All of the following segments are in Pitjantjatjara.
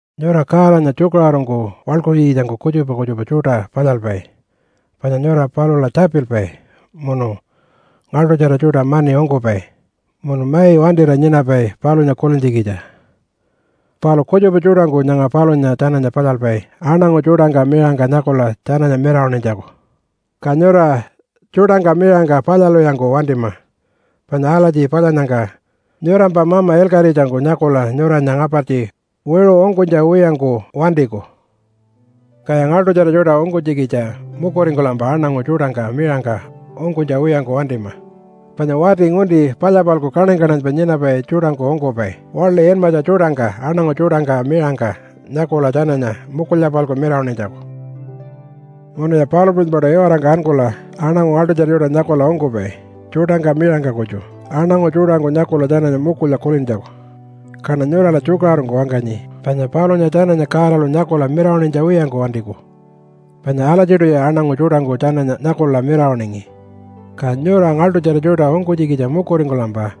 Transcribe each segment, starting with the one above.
“Nyura Godanya tjukaṟurungku waḻkuntjikitjangku kutjupa kutjupa tjuṯa palyalpai, panya nyura palula tjapilpai, munu ngaḻṯutjara tjuṯa mani ungkupai, munu mai wantira nyinapai palunya kulintjikitja. Palu kutjupa tjuṯangku nyanga palunya tjananya palyalpai aṉangu tjuṯangka miṟangka nyakula tjananya mirawaṉinytjaku. Ka nyura tjuṯangka miṟangka palyalwiyangku wantima, panya alatji palyannyangka nyurampa mama ilkaṟitjangku nyakula nyuranya ngapartji wiṟu ungkunytja wiyangku wantiku. “Kaya ngaḻṯutjara tjuṯa ungkunytjikitja mukuringkulampa aṉangu tjuṯangka miṟangka ungkunytja wiyangku wantima. Panya wati ngunti palya-palku kaṉany-kaṉanypa nyinapai tjuṯangku ungkupai waḻi inmatja tjuṯangka aṉangu tjuṯangka miṟangka nyakula tjananya mukulya-palku mirawaṉinytjaku. “Munuya palu puṟunypaṯu iwarangka ankula aṉangu ngaḻṯutjara tjuṯa nyakula ungkupai tjuṯangka miṟangka kutju aṉangu tjuṯangku nyakula tjananya mukulya kulintjaku. Kaṉa nyurala tjukaṟurungku wangkanyi, panya palunya tjananya Godalu nyakula mirawaṉinytja wiyangku wantiku, panya alatjiṯuya aṉangu tjuṯangku tjananya nyakula mirawaṉingi. Ka nyura ngaḻṯutjara tjuṯa ungkunytjikitja mukuringkulampa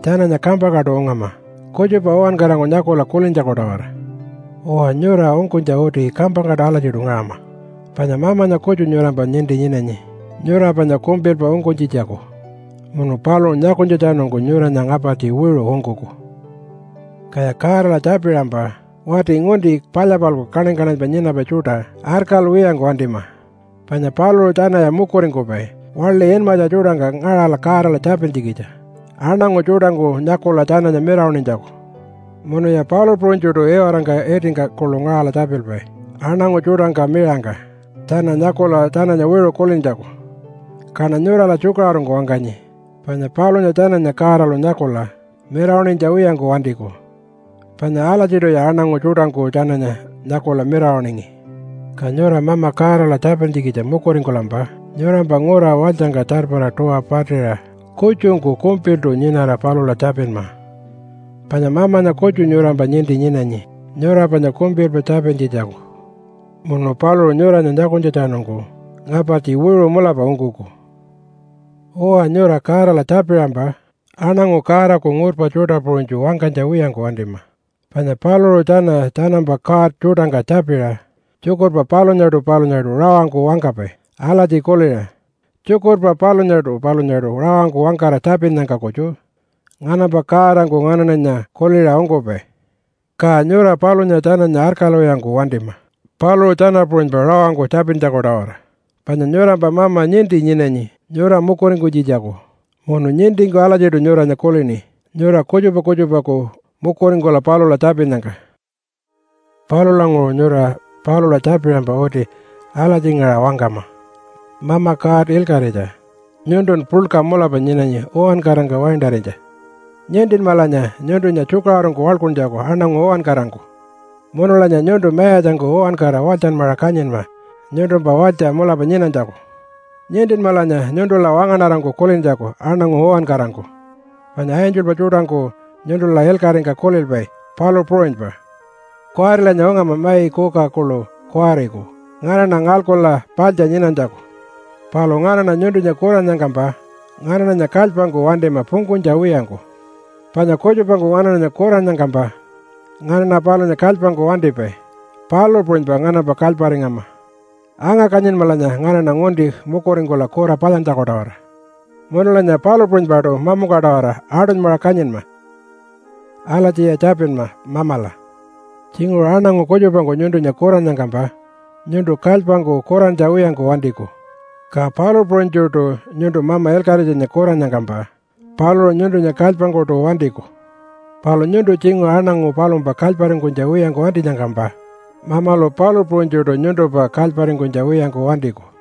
tjananya kampangkaṯu ungama kutjupa uwankarangku nyakula kulintjaku-tawara. Uwa, nyura ungkunytja uti kampangkaṯu alatjiṯu ngaṟama. Panya Mamanya kutju nyurampa ninti nyinanyi nyura panya kumpilpa ungkunytjitjaku, munu paluṟu nyakunytjatjanungku nyuranya ngapartji wiṟu ungkuku. “Kaya Godala tjapiṟampa wati ngunti palya-palku kaṉany-kaṉanypa nyinapai tjuṯa arkalwiyangku wantima panya paluṟu tjanaya mukuringkupai waḻi inmatja tjuṯangka ngaṟala Godala tjapintjikitja aṉangu tjuṯangku nyakula tjananya mirawaṉinytjaku. Munuya palu puṟunytjuṯu iwarangka itingka kuḻu ngaṟala tjapilpai aṉangu tjuṯangka miṟangka tjana nyakula tjananya wiṟu kulintjaku. Kaṉa nyurala tjukaṟurungku wangkanyi, panya palunya tjananya Godalu nyakula mirawaṉinytja wiyangku wantiku, panya alatjiṯuya aṉangu tjuṯangku tjananya nyakula mirawaṉingi. Ka nyura Mama Godala tjapintjikitja mukuringkulampa nyurampa ngura walytjangka tjarpara tuwa patiṟa kutjungku kumpiltu nyinara palula tjapinma. Panya Mamanya kutju nyurampa ninti nyinanyi nyura panya kumpilpa tjapintjitjaku munu paluṟu nyuranya nyakunytjatjanungku ngapartji wiṟu mulapa ungkuku. “Uwa, nyura Godala tjapiṟampa aṉangu Godaku ngurpa tjuṯa puṟunytju wangkanytja wiyangku wantima. Panya paluṟu tjana tjanampa god tjuṯangka tjapiṟa tjukurpa palunyaṯu palunyaṯu rawangku wangkapai alatji kuliṟa, ‘Tjukurpa palunyaṯu palunyaṯu rawangku wangkara tjapinnyangka kutju nganampa godangku nganaṉanya kuliṟa ungkupai.’ Ka nyura palunya tjananya arkalwiyangku wantima paluṟu tjana puṟunypa rawangku tjapintjaku-tawara, panya nyurampa Mama ninti nyinanyi nyura mukuringkunytjitjaku munu nintingku alatjiṯu nyuranya kulini nyura kutjupa kutjupaku mukuringkula palula tjapinnyangka. Palulanguṟu nyura palula tjapiṟampa uti alatjingaṟa wangkama, ‘Mama God ilkaṟitja! Nyuntun puḻka mulapa nyinanyi uwankarangka waintarinytja. Nintinmalanya nyuntunya tjukaṟurungku waḻkuntjaku aṉangu uwankarangku. Munulanya nyuntu mayatjangku uwankara walytjanmaṟa kanyinma nyuntumpa walytja mulapa nyinanytjaku. Nintinmalanya nyuntula wangaṉarangku kulintjaku aṉangu uwankarangku, panya angelpa tjuṯangku nyuntula ilkaṟingka kulilpai, palu puṟunypa. Kuwarilanya ungama mai kuka kuḻu kuwariku nganaṉa ngalkula paḻtja nyinanytjaku. Palu nganaṉa nyuntunya kurannyangkampa nganaṉanya kalypangku wantima pungkunytja wiyangku. Panya kutjupangku nganaṉanya kurannyangkampa nganaṉa palunya kalypangku wantipai, palu puṟunypa nganampa kalyparingama. Anga-kanyinmalanya nganaṉa ngunti mukuringkula kura palyantjaku-tawara. Munulanya palu puṟunypaṯu mamungka-tawara aṯunymaṟa kanyinma.’ Alatjiya tjapinma Mamala. Tjinguṟu aṉangu kutjupangku nyuntunya kurannyangkampa nyuntu kalypangku kurantja wiyangku wantiku, ka palu puṟunytjuṯu nyuntu Mama Ilkaṟitjanya kurannyangkampa paluṟu nyuntunya kalypangkuṯu wantiku. Palu nyuntu tjinguṟu aṉangu palumpa kalyparingkunytja wiyangku wantinyangkampa Mamalu palu puṟunytjuṯu nyuntumpa kalyparingkunytja wiyangku wantiku.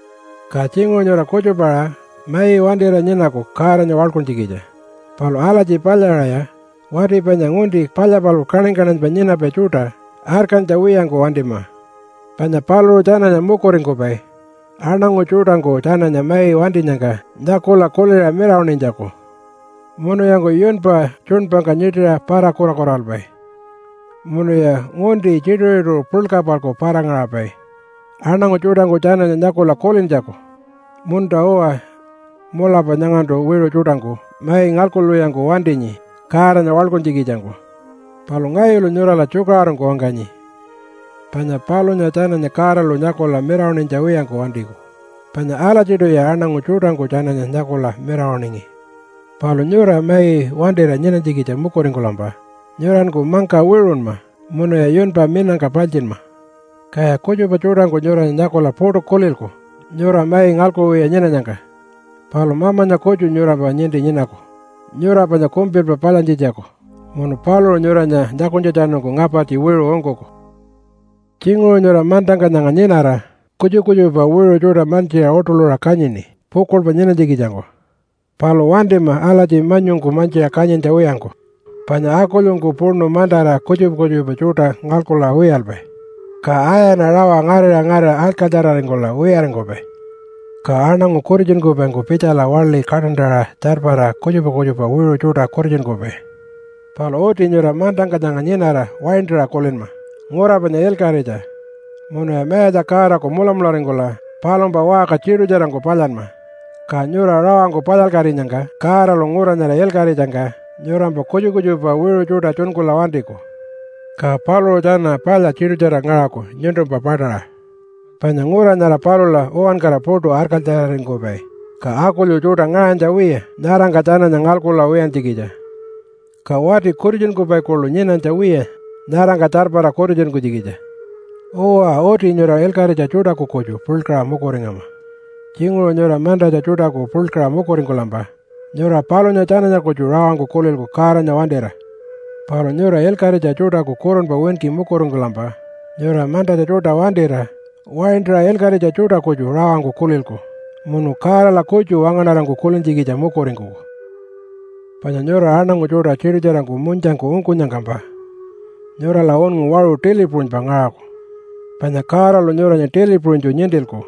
“Ka tjinguṟu nyura kutjupa-aṟa mai wantira nyinaku Godanya waḻkuntjikitja. Palu alatji palyaṟaya wati panya ngunti palya-palku kaṉany-kaṉanypa nyinapai tjuṯa arkantja wiyangku wantima. Panya paluṟu tjanaya mukuringkupai aṉangu tjuṯangku tjananya mai wantinyangka nyakula kuliṟa mirawaṉinytjaku. Munuyanku yunpa tjuṉpangka nyiṯiṟa para-kurakuralpai munuya ngunti tjituṟu-tjituṟu puḻka-palku para-ngaṟapai aṉangu tjuṯangku tjananya nyakula kulintjaku, ‘Munta-uwa, mulapa nyangantu wiṟu tjuṯangku mai ngalkuwiyangku wantinyi Godanya waḻkuntjikitjangku.’ Palu ngayulu nyurala tjukaṟurungku wangkanyi, panya palunya tjananya Godalu nyakula mirawaṉinytja wiyangku wantiku, panya alatjiṯuya aṉangu tjuṯangku tjananya nyakula mirawaṉingi. Palu nyura mai wantira nyinanytjikitja mukuringkulampa nyuranku mangka wiṟunma munuya yunpa minangka paltjinma. Kaya kutjupa tjuṯangku nyuranya nyakula puṯu kulilku nyura mai ngalkuwiya nyinanyangka. Palu Mamanya kutju nyurampa ninti nyinaku nyura panya kumpilpa palyantjitjaku munu paluṟu nyuranya nyakunytjatjanungku ngapartji wiṟu ungkuku. “Tjinguṟu nyura mantangka nyanga nyinara kutjupa kutjupa wiṟu tjuṯa mantjiṟa uṯuḻuṟa kanyini pukuḻpa nyinanytjikitjangku. Palu wantima alatji manyungku mantjiṟa kanyintja wiyangku, panya akulyungku puṉu mantara kutjupa kutjupa tjuṯa ngalkula wiyalpai, ka ayana rawa ngarira ngarira arkalytjararingkula wiyaringkupai. Ka aṉangu kutitjunkupaingku pitjala waḻi kaṯantaṟa tjarpara kutjupa kutjupa wiṟu tjuṯa kutitjunkupai. Palu uti nyura mantangka nyanga nyinara waintaṟa kulinma ngura panya ilkaṟitja, munuya Mayatja Godaku mulamularingkula palumpa waṟka tiṯutjarangku palyanma, ka nyura rawangku palyalkatinyangka Godalu ngura nyara ilkaṟitjangka nyurampa kutjupa kutjupa wiṟu tjuṯa tjunkula wantiku. Ka paluṟu tjana palya tiṯutjara ngaṟaku nyuntumpa paṯaṟa, panya ngura nyara palula uwankara puṯu arkalytjararingkupai, ka akulyu tjuṯa ngaṟanytja wiya nyarangka tjananya ngalkula wiyantjikitja, ka wati kutitjunkupai kuḻu nyinanytja wiya nyarangka tjarpara kutitjunkunytjikitja. Uwa, uti nyura ilkaṟitja tjuṯaku kutju puḻkaṟa mukuringama. Tjinguṟu nyura mantatja tjuṯaku puḻkaṟa mukuringkulampa nyura palunya tjananya kutju rawangku kulilku Godanya wantira. Palu nyura ilkaṟitja tjuṯaku kurunpa winki mukuringkulampa nyura mantatja tjuṯa wantira waintaṟa ilkaṟitja tjuṯa kutju rawangku kulilku munu Godala kutju wangaṉarangku kulintjikitja mukuringkuku. “Panya nyura aṉangu tjuṯa tiṯutjarangku munytjangku ungkunyangkampa nyurala unngu waṟu tili puṟunypa ngaṟaku, panya Godalu nyuranya tili puṟunytju nintilku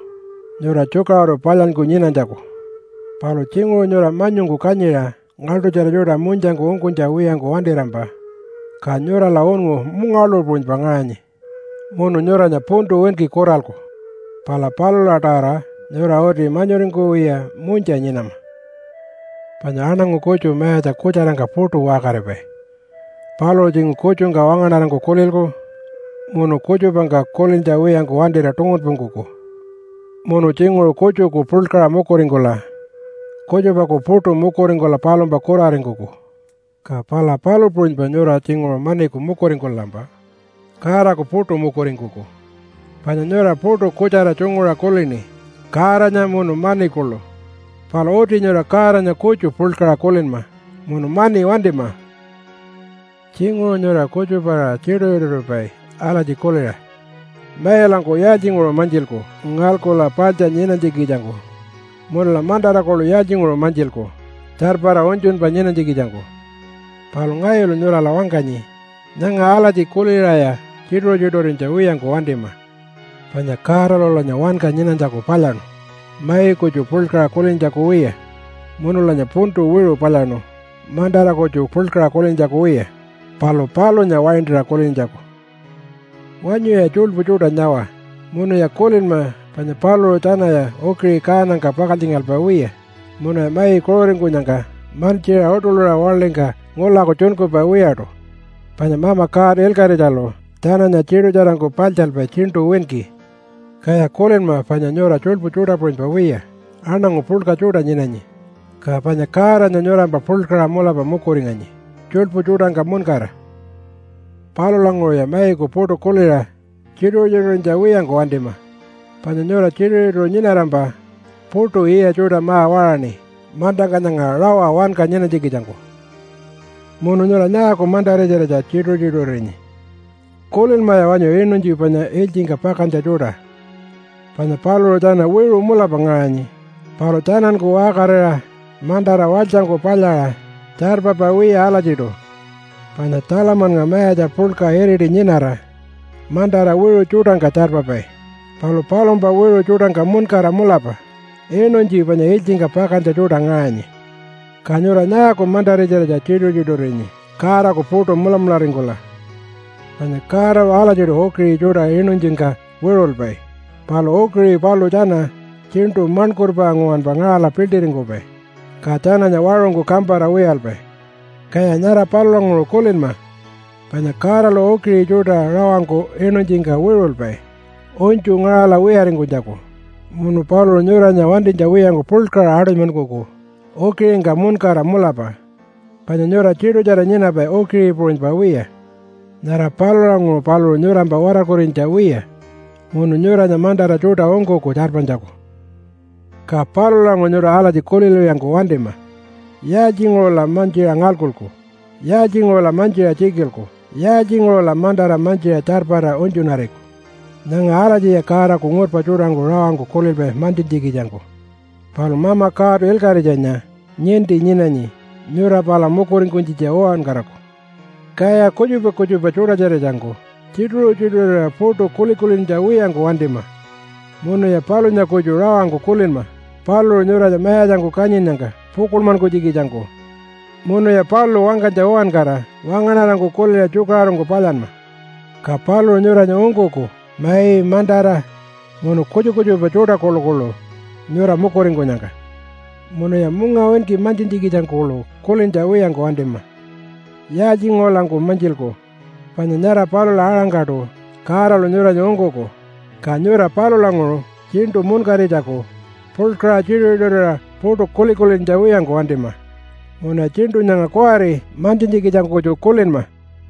nyura tjukaṟuru palyanyku nyinanytjaku. Palu tjinguṟu nyura manyungku kanyiṟa ngaḻṯutjara tjuṯa munytjangku ungkunytja wiyangku wantirampa, ka nyurala unngu mungawaḻuṟu puṟunypa ngaṟanyi munu nyuranya puntu winki kuralku. Pala palula-tawara nyura uti manyuringkuwiya munytja nyinama. “Panya aṉangu kutju mayatja kutjarangka puṯu waṟkaripai. Paluṟu tjinguṟu kutjungka wangaṉarangku kulilku munu kutjupangka kulintja wiyangku wantira tungunpungkuku. Munu tjinguṟu kutjuku puḻkaṟa mukuringkula kutjupaku puṯu mukuringkula palumpa kuraringkuku. Ka pala palu puṟunypa nyura tjinguṟu maniku mukuringkulampa Godaku puṯu mukuringkuku. Panya nyura puṯu kutjara tjunguṟa kulini Godanya munu mani kuḻu. Palu uti nyura Godanya kutju puḻkaṟa kulinma munu mani wantima. “Tjinguṟu nyura kutjupa-aṟa tjituṟu-tjituṟuripai alatji kuliṟa, ‘Mailanku yaaltjinguṟu mantjilku ngalkula paḻtja nyinanytjikitjangku, munula mantara kuḻu yaaltjinguṟu mantjilku tjarpara unytjunpa nyinanytjikitjangku?’ Palu ngayulu nyurala wangkanyi nyanga alatji kuliṟaya tjituṟu-tjituṟurinytja wiyangku wantima! Panya Godalulanya wanka nyinanytjaku palyaṉu mai kutju puḻkaṟa kulintjaku wiya, munulanya puntu wiṟu palyaṉu mantara kutju puḻkaṟa kulintjaku wiya, palu palunya waintaṟa kulintjaku. “Wanyuya tjuḻpu tjuṯa nyawa munuya kulinma panya paluṟu tjanaya ukiṟi kaanangka pakaltjingalpai wiya munuya mai kuṟuringkunyangka mantjiṟa uṯuḻuṟa waḻingka ngulaku tjunkupai wiyaṯu, panya Mama God Ilkaṟitjalu tjananya tiṯutjarangku paḻtjalpai tjiṉṯu winki. Kaya kulinma panya nyura tjuḻpu tjuṯa puṟunypa wiya aṉangu puḻka tjuṯa nyinanyi, ka panya Godanya nyurampa puḻkaṟa mulapa mukuringanyi tjuḻpu tjuṯangka muṉkara. “Palulanguṟuya maiku puṯu kuliṟa tjituṟu-tjituṟurinytja wiyangku wantima, panya nyura tjituṟu-tjituṟu nyinarampa puṯu yiya tjuṯa ma-waṟaṉi mantangka nyanga rawa wanka nyinanytjikitjangku. “Munu nyura nyaaku mantara-tjiratja tjituṟu-tjituṟurinyi? Kulinmaya wanyu inuntji panya ilytjingka pakantja tjuṯa, panya paluṟu tjana wiṟu mulapa ngaṟanyi, palu tjananku waṟkarira mantara walytjangku palyaṟa tjarpapai wiya alatjiṯu. Panya Tjalamannga mayatja puḻka iriti nyinara mantara wiṟu tjuṯangka tjarpapai, palu palumpa wiṟu tjuṯangka muṉkara mulapa inuntji panya ilytjingka pakantja tjuṯa ngaṟanyi. Ka nyura nyaaku mantara-tjiratja tjituṟu-tjituṟurinyi Godaku puṯu mulamularingkula? Panya Godalu alatjiṯu ukiṟi tjuṯa inuntjingka wiṟulpai, palu ukiṟi paluṟu tjana tjiṉṯu maṉkurpa nguwanpa ngaṟala piḻṯiringkupai, ka tjananya waṟungku kampara wiyalpai. Kaya nyara palulanguṟu kulinma, panya Godalu ukiṟi tjuṯa rawangku inuntjingka wiṟulpai unytju ngaṟala wiyaringkunytjaku, munu paluṟu nyuranya wantinytja wiyangku puḻkaṟa aṯunymankuku ukiṟingka muṉkara mulapa, panya nyura tiṯutjara nyinapai ukiṟi puṟunypa wiya. Nyara palulanguṟu paluṟu nyurampa watarkurinytja wiya, munu nyuranya mantara tjuṯa ungkuku tjarpanytjaku. “Ka palulanguṟu nyura alatji kulilwiyangku wantima, ‘Yaaltjinguṟula mantjiṟa ngalkuku? Yaaltjinguṟula mantjiṟa tjikilku? Yaaltjinguṟula mantara mantjiṟa tjarpara unytjunariku?’ Nyanga alatjiya Godaku ngurpa tjuṯangku rawangku kulilpai mantjintjikitjangku. Palu Mama God Ilkaṟitjanya ninti nyinanyi nyura pala mukuringkunytjitja uwankaraku. Kaya kutjupa kutjupa tjuṯa-tjiratjangku tjituṟu-tjituṟurira puṯu kuli-kulintja wiyangku wantima, munuya palunya kutju rawangku kulinma paluṟu nyuranya mayatjangku kanyinnyangka pukuḻmankunytjikitjangku, munuya paluṟu wangkanytja uwankara wangaṉarangku kuliṟa tjukaṟurungku palyanma. Ka paluṟu nyuranya ungkuku mai, mantara, munu kutjupa kutjupa tjuṯa kuḻukuḻu nyura mukuringkunyangka. Munuya mungawinki mantjintjikitjangku kuḻu kulintja wiyangku wantima, ‘Yaaltjinguṟulanku mantjilku?’ Panya nyara palula-aṟangkaṯu Godalu nyuranya ungkuku, ka nyura palulanguṟu tjiṉṯu munkaritjaku puḻkaṟa tjituṟu-tjituṟurira puṯu kuli-kulintja wiyangku wantima, munuya tjiṉṯu nyanga kuwari mantjintjikitjangku kutju kulinma.”